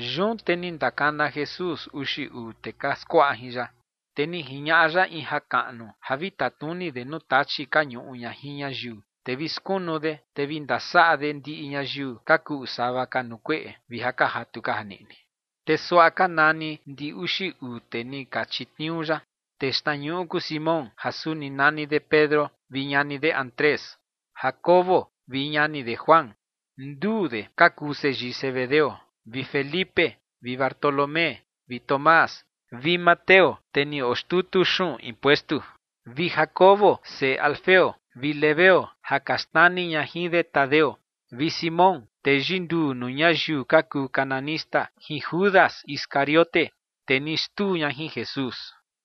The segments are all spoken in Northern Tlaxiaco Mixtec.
Yun te ni ndakana Jesús uxi uu tee ka skuaꞌa jin ya, te ni jiñaꞌa ya in jakaꞌnu ja vi tatnuni de nuu tachi ka ñuꞌu ña jin ñayiu, te vi skunu de, te vi ndasaꞌa de ndiꞌi ñayiu ka kuꞌu sava ka nuu kueꞌe vi ja ka jatu ka janiꞌni. Te suaꞌa ka nani ndi uxi uu tee ni chitniuu ya. Tee xtnañuꞌu kuu Simón, ja suni nani de Pedro, vi ñani de Andrés, Jacobo vi ñani de Juan, nduu de ka kuu seyii Zebedeo, vi Felipe, vi Bartolomé, vi Tomás, vi Mateo, tee ni oo xtutu xuꞌun impuestu, vi Jacobo seꞌe Alfeo, vi Lebeo ja ka xnani ña jin de Tadeo, vi Simón, tee yinduu nuu ñayiu ka kuu cananista, jin Judas Iscariote tee ni xtuu ña jin Jesús.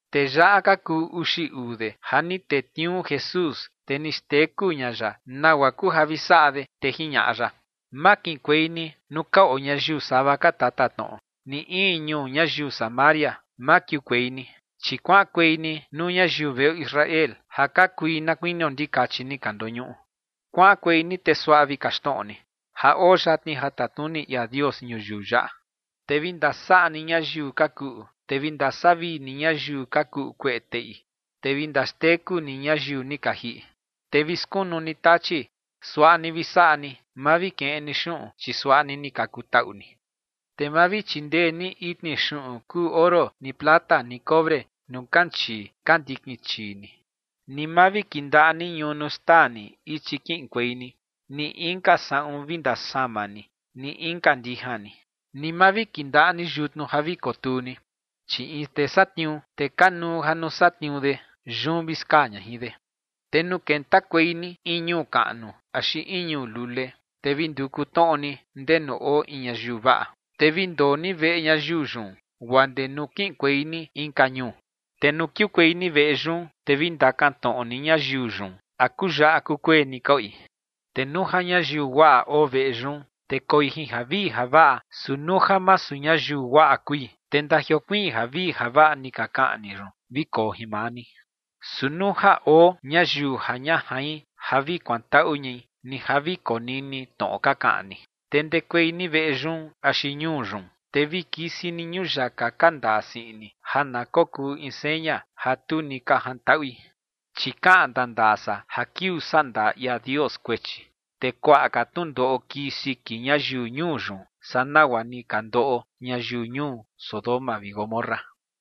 Tee yaꞌa ka kuu uxi uu de ja ni tetniuu Jesús, te ni xteku ña ya nagua kuu ja vi saꞌa de, te jiñaꞌa ya: ͏―͏Ma kiꞌinkuei ni nuu ka oo ñayiu sava ka tatatnoꞌo, ni in ñuu ñayiu Samaria, ma kiukuei ni. Chi kuaꞌankuei ni nuu ñayiu veꞌo Israel ja ka kui na kuinio ndikachi ni ka ndoñuꞌu. Kuaꞌankuei ni te suaꞌa vi kaxtnoꞌo ni: “Ja oo yatni ja tatnuni ia Dios ñuyiu yaꞌa”. Te vi ndasaꞌa ni ñayiu ka kuꞌu, te vi ndasavii ni ñayiu ka kuꞌu kueꞌe teꞌi, te vi ndaxteku ni ñayiu ni ka jiꞌi, te vi skunu ni tachi. Suaꞌa ni vi saꞌa ni, ma vi keꞌen ni xuꞌun, chi suaꞌa ni ni ka kutaꞌu ni. ’Te ma vi chindee ni itni xuꞌun kuu oro ni plata ni cobre nuu kanchii ka ndikin chii ni. Ni ma vi kindaꞌa ni ñunu xtaa ni ichi kiꞌinkuei ni, ni inka saꞌun vi ndasama ni, ni inka ndijan ni, ni ma vi kindaꞌa ni yutnu ja vi kotuu ni. Chi in tee satniuu, te kanuu ja nuu satniuu de, yun vi skaa ña jin de. ’Te nuu kentakuei ni in ñuu kaꞌnu axi in ñuu lule, te vi nduku tnoꞌo ni ndenu oo in ñayiu vaꞌa, te vi ndoo ni veꞌe ñayiu yun, guaa ndee nuu kiꞌinkuei ni inka ñuu. Te nuu kiukuei ni veꞌe yun, te vi ndakantnoꞌo ni ñayiu yun a kuyaꞌa kukueni ka oi. Te nuu ja ñayiu guaꞌa oo veꞌe yun, te koi jin javii javaꞌa, su nuu ja masu ñayiu guaꞌa kui, te ndajiokuiin javii javaꞌa ni ka kaꞌan ni yun vi koo jin maa ni. Su nuu ja oo ñayiu ja ña jain ja vi kuantaꞌu ñai, ni ja vi konini tnoꞌo ka kaꞌan ni, te ndekuei ni veꞌe yun axi ñuu yun, te vi kisi ni ñuyaka ka ndaa siꞌin ni ja na kokuu in seña ja tu ni ka jantaꞌui. Chi kaꞌan ndandaa san ja kiuu sandaa ia Dios kuechi, te kuaꞌa ka tnundoꞌo kii siki ñayiu ñuu yun, saa nagua ni ka ndoꞌo ñayiu ñuu Sodoma vi Gomorra.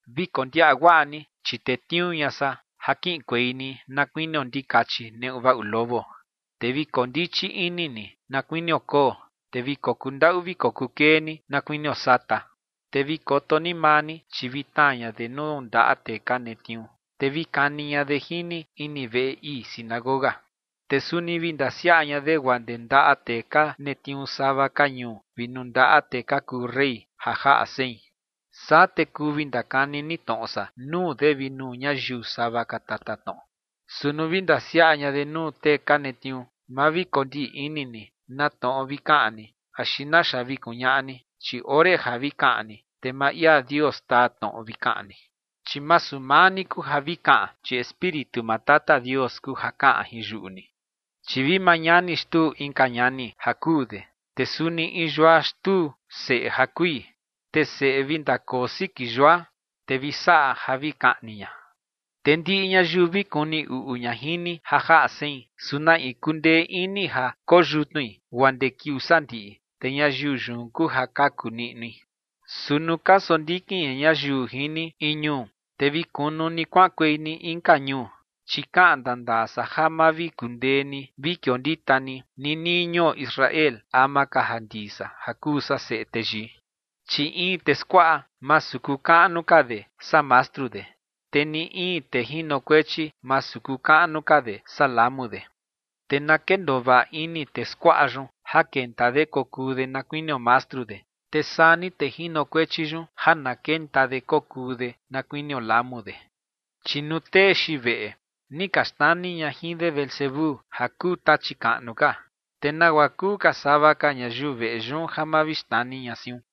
’Vi kondiaꞌa guaꞌa ni, chi tetniuu ña san ja kiꞌinkuei ni na kuinio ndikachi neꞌu vaꞌu lobo. Te vi kondichi ini ni na kuinio koo, te vi kokundaꞌu vi kokukee ni na kuinio sata. Te vi koto ni maa ni, chi vi tnaa ña de nuu ndaꞌa tee ka netniuu, te vi kani ña de jin ni ini veꞌe ii sinagoga. Te suni vi ndasiaꞌa ña de guaa ndee ndaꞌa tee ka netniuu sava ka ñuu vi nuu ndaꞌa tee ka kuu rey ja jaꞌa sein. Saa te kuu vi ndakani ni tnoꞌo san nuu de vi nuu ñayiu sava ka tatatnoꞌo. Su nuu vi ndasiaꞌa ña de nuu tee ka netniuu, ma vi kondiꞌni ni na tnoꞌo vi kaꞌan ni axi naxa vi kuñaꞌa ni, chi ore ja vi kaꞌan ni, te maa ia Dios taa tnoꞌo vi kaꞌan ni. Chi masu maa ni kuu ja vi kaꞌan, chi Espíritu maa Tata Dios kuu ja kaꞌan jin yuꞌu ni. ’Chi vi maa ñani xtuu inka ñani ja kuu de, te suni in yua xtuu seꞌe ja kui, te seꞌe vi ndakoo siki yua, te vi saꞌa ja vi kaꞌni ña. Te ndiꞌi ñayiu vi kuni uꞌu ña jin ni ja jaꞌa sein, su na in kundee ini ja koyutnui guaa ndee kiuu sandiꞌi, te ñayiu yun kuu ja kaku niꞌnui. Su nuu ka sondikin ña ñayiu jin ni in ñuu, te vi kunu ni kuaꞌankuei ni inka ñuu. Chi kaꞌan ndandaa san ja ma vi kundee ni vi kiondita ni ninii ñuo Israel ama ka ja ndii san ja kuu san Seꞌe Teyii. ’Chi in tee skuaꞌa, masu kuu kaꞌnu ka de saa mastru de, te ni in tee jinokuechi, masu kuu kaꞌnu ka de saa lamu de. Te na kendoo vaꞌa ini tee skuaꞌa yun ja kenta de kokuu de na kuinio mastru de, te saa ni tee jinokuechi yun ja na kenta de kokuu de na kuinio lamu de. Chi nuu tee xiin veꞌe, ni ka xnani ña jin de Beelzebú ja kuu tachi kaꞌnu ka, te ¿nagua kuu ka sava ka ñayiu veꞌe yun ja ma vi xnani ña siun?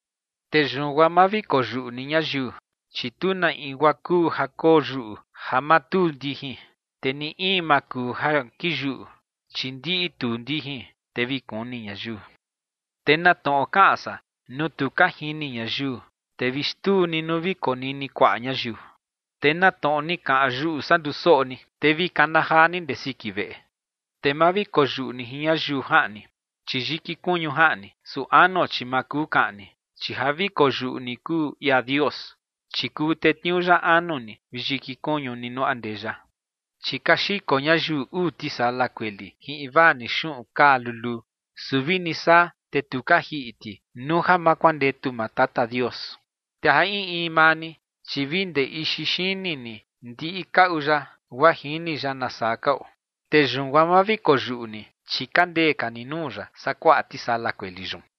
’Te yun guaa ma vi koyuꞌu ni ñayiu, chi tu na in guaa kuu ja koyuꞌu ja ma tuu ndijin, te ni in ma kuu ja kiyuꞌu, chi ndiꞌi tuu ndijin, te vi kuni ñayiu. Te na tnoꞌo kaꞌan san nuu tu ka jini ñayiu, te vi xtuu ni nuu vi konini kuaꞌa ñayiu. Te na tnoꞌo ni kaꞌan yuꞌu san ndusoꞌo ni, te vi kana jaa ni ndee siki veꞌe. Te ma vi koyuꞌu ni jin ñayiu jaꞌni, chi yiki kuñu jaꞌni, su anuo chi ma kuu kaꞌni. Chi ja vi koyuꞌu ni kuu ia Dios, chi kuu tetniuu ya anu ni vi yiki kuñu ni nuu andeya. ’Chi ka xiko ñayiu uu tisala kueli jin invaa ni xuꞌun kaa luluu. Su vini saa, te tu ka jiꞌi ti nuu ja ma kuandetu maa Tata Dios. Te ja in in maa ni, chi vi ndee ixi xini ni ndiꞌi kaꞌu ya guaa jini ya nasaa ka oo. Te yun guaa ma vi koyuꞌu ni, chi ka ndee ka ni nuu ya saa kuaꞌa tisala kueli yun.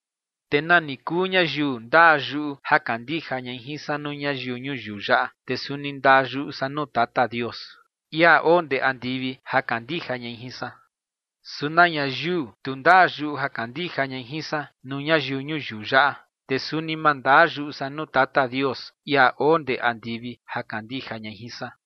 ’Te nani kuu ñayiu ndaa yuꞌu ja kandija ñai jin san nuu ñayiu ñuyiu yaꞌa, te suni ndaa yuꞌu san nuu Tata Dios, ia oo ndee andivi, ja kandija ñai jin san. Su na ñayiu tu ndaa yuꞌu ja kandija ñai jin san nuu ñayiu ñuyiu yaꞌa, te suni ma ndaa yuꞌu san nuu Tata Dios, ia oo ndee andivi, ja kandija ñai jin san.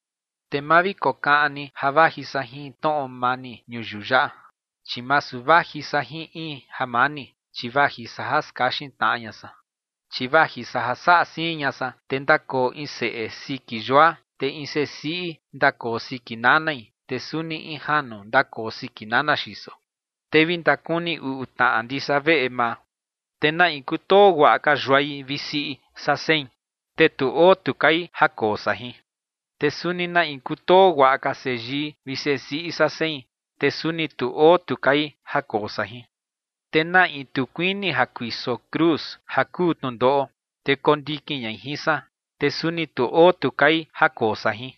’Te ma vi kokaꞌan ni ja vaji san jin tnoꞌo mani ñuyiu yaꞌa, chi masu vaji san jin in jamani, chi vaji san ja skaxin tnaꞌa ña san. Chi vaji san ja saꞌa siin ña san, te ndakoo in seꞌe siki yua, te in sesiꞌi ndakoo siki nanai, te suni in janu ndakoo siki nana xiso. Te vi ndakuni uꞌu tnaꞌa ndisa veꞌe maa. ’Te na in kutoo guaꞌa ka yuai vi siꞌi saa sein, te tu oo tu kai ja koo san jin. Te suni na in kutoo guaꞌa ka seyii vi sesiꞌi saa sein, te suni tu oo tu kai ja koo san jin. Te na in tu kuini ja kuiso cruz ja kuu tnundoꞌo, te kondikin ñai jin san, te suni tu oo tu kai ja koo san jin.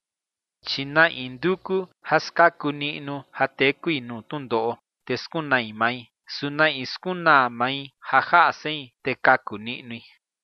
Chi na in nduku ja skaku niꞌnu ja tekui nuu tnundoꞌo, te skunai mai. Su na in skunaa mai ja jaꞌa sein, te kaku niꞌnui.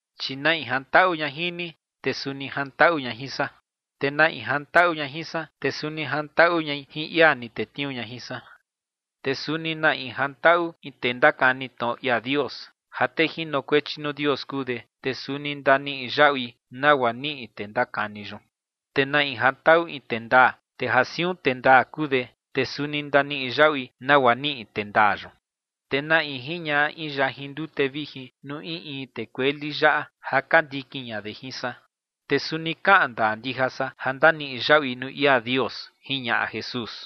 ’Chi na in jantaꞌu ña jin ni, te suni jantaꞌu ña jin san. Te na in jantaꞌu ña jin san, te suni jantaꞌu ñai jin ia ni tetniuu ña jin san. Te suni na in jantaꞌu in tee ndakani tnoꞌo ia Dios, ja tee jinokuechi nuu Dios kuu de, te suni ndaniꞌi yaꞌui nagua niꞌi tee ndakani yun. Te na in jantaꞌu in tee ndaa, te ja siun tee ndaa kuu de, te suni ndaniꞌi yaꞌui nagua niꞌi tee ndaa yun. Te na in jiñaꞌa in yajin ndute vijin nuu in in tee kueli yaꞌa ja ka ndikin ña de jin san, te suni kaꞌan ndaa ndija san ja ndaniꞌi yaꞌui nuu ia Dios ͏―͏jiñaꞌa Jesús.